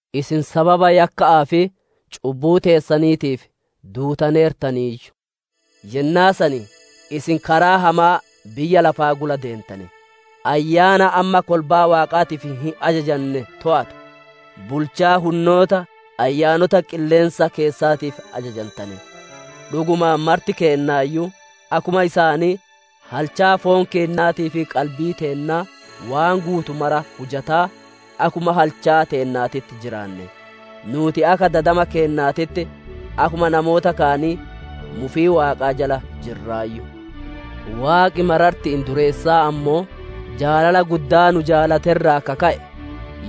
Isin sababa yakka'aa fi cubbuu teessaniitiif duutaneertaniiyyu. Yennaa san isin karaa hamaa biyya lafaa gula deentane; ayyaana amma kolbaa Waaqaaf hin ajajanne toowatu, bulchaa hunnoota ayyaanota qilleensa keessaatiif ajajantane. Dhugumaan marti keennaayyuu akkuma isaanii halchaa foon keennaatii fi qalbii teennaa waan guutu mara hujataa, akkuma halchaa teennaatitti jiraanne. Nuuti akka dadama keennaatitti, akkuma namoota kaanii, mufii Waaqaa jala jirraayyu. Waaqi mararti'iin dureessaa ammoo, jaalala guddaa nu jaalate irraa ka ka'e,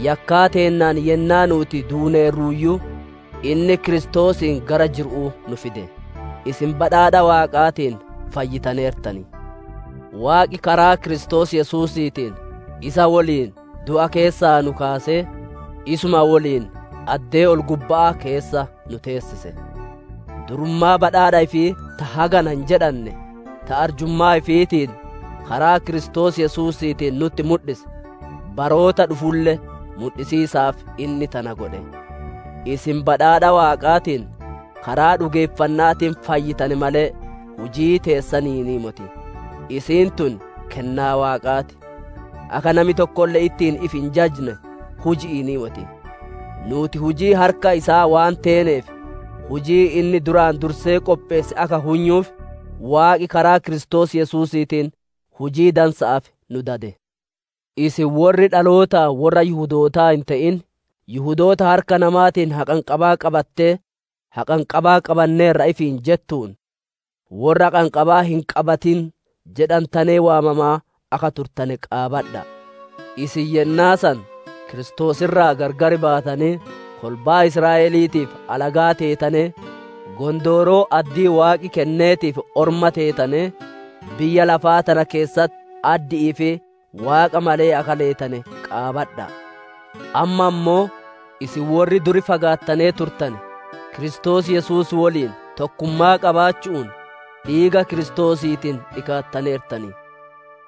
yakkaa teennaan yennaa nuuti duuneerruuyyuu, inni Kiristoosiin gara jiru'uu nu fide. Isin badhaadha Waaqaatiin fayyitaneertan. Waaqi karaa Kiristoos Yesuusiitiin isa woliin du'a keessaa nu kaasee, isuma woliin addee ol-gubba'aa keessa nu teessise. Durummaa badhaadha ifii ta hagana hin jedhanne, ta arjummaa ifiitiin karaa Kiristoos Yesuusiitiin nutti mudhise, baroota dhufulle mudhisiisaaf inni tana godhe. Isin badhaadha Waaqaatiin karaa dhugeeffanna'aatiin fayyitane malee, hujii teessaniinii moti; isiin tun kennaa Waaqaa ti. Akka nami tokkolle ittiin ifi hin jajne, huji'iinii moti. Nuuti hujii harka isaa waan teeneef, hujii inni duraan dursee qopheesse akka hunyuuf, Waaqi karaa Kiristoos Yesuusiitiin hujii dansa'aaf nu dade. Isin worri dhalootaan worra Yihudootaa hin te'in, Yihudoota harka namaatiin haqanqabaa qabattee, «Haqanqabaa qabanneerra» ifiin jettuun, «Worra haqanqabaa hin qabatin» jedhantanee waamamaa akka turtane qaabadha'a. Isin yennaa san Kiristoos irraa gargar baatanee, kolbaa Israa'eliitiif alagaa teetanee, gondooroo addii Waaqi kenneetiif orma teetanee, biyya lafaa tana keessatti addi'ii fi Waaqa malee akka leetane qaabadha'a. Amma ammoo, isin worri dur fagaattanee turtane, Kiristoos Yesuus woliin tokkummaa qabaachu'uun, dhiiga Kiristoosiitiin dhikaattaneertan.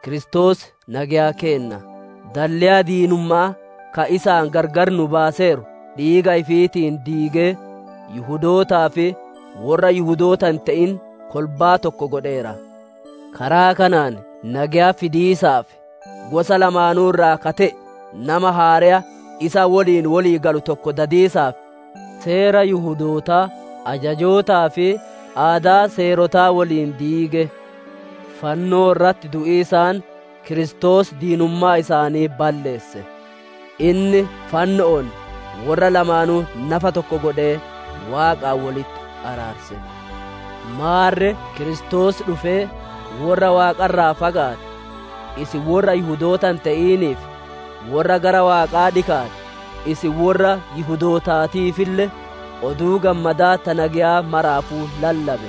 Kiristoos nageya keenna; dalleya diinumma'aa ka isaan gargar nu baaseeru dhiiga ifiitiin diigee, Yihudootaa fi worra Yihudoota hin te'in kolbaa tokko godheera. Karaa kanaan nageya fidiisaaf, gosa lamaanuu irraa ka te'e nama haareya isa woliin wolii galu tokko dadiisaaf, Seera Yihudootaa ajajootaa fi aadaa seerotaa woliin diige. Fannoo irratti du'iisaan Kiristoos diinummaa isaanii balleesse; inni fanno'oon worra lamaanuu nafa tokko godhee Waaqaan wolitti araarse. Maarre Kiristoos dhufee worra Waaqa irraa fagaate, isin worra Yihudoota hin te'iniif, worra gara Waaqaa dhikaate, isin worra Yihudootaatiifille, Oduu Gammadaa ta nageyaa maraafuu lallabe.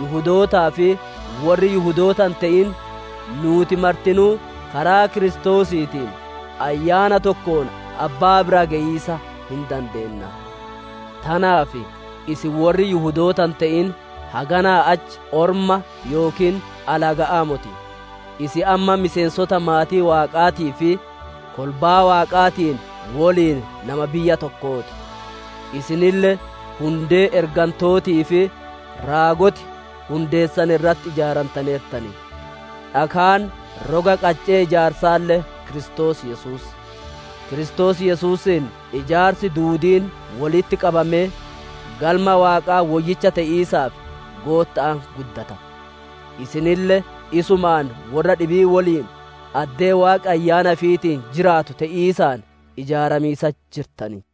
Yihudootaa fi worri Yihudoota hin te'in, nuuti martinuu karaa Kiristoosiitiin Ayyaana tokkoon Abbaa bira geyiisa hin dandeenna. Tanaaf, isin worri Yihudoota hin te'in haganaa achi orma yookiin alaga'aa moti; isin amma miseensota maatii Waaqaatii fi kolbaa Waaqaatiin woliin nama biyya tokkoo ti. Isinille hundee ergantootii fi raagoti hundeessan irratti ijaarantaneertan; dhakaan roga qaccee ijaarsaalle Kiristoos Yesuus. Kiristoos Yesuusiin ijaarsi duudiin wolitti qabamee, Galma Waaqaa woyyicha te'iisaaf Gootta'aan guddata. Isinille isumaan worra dhibii woliin addee Waaqi Ayyaana ifiitiin jiraatu te'iisaan ijaaramiisatti jirtan.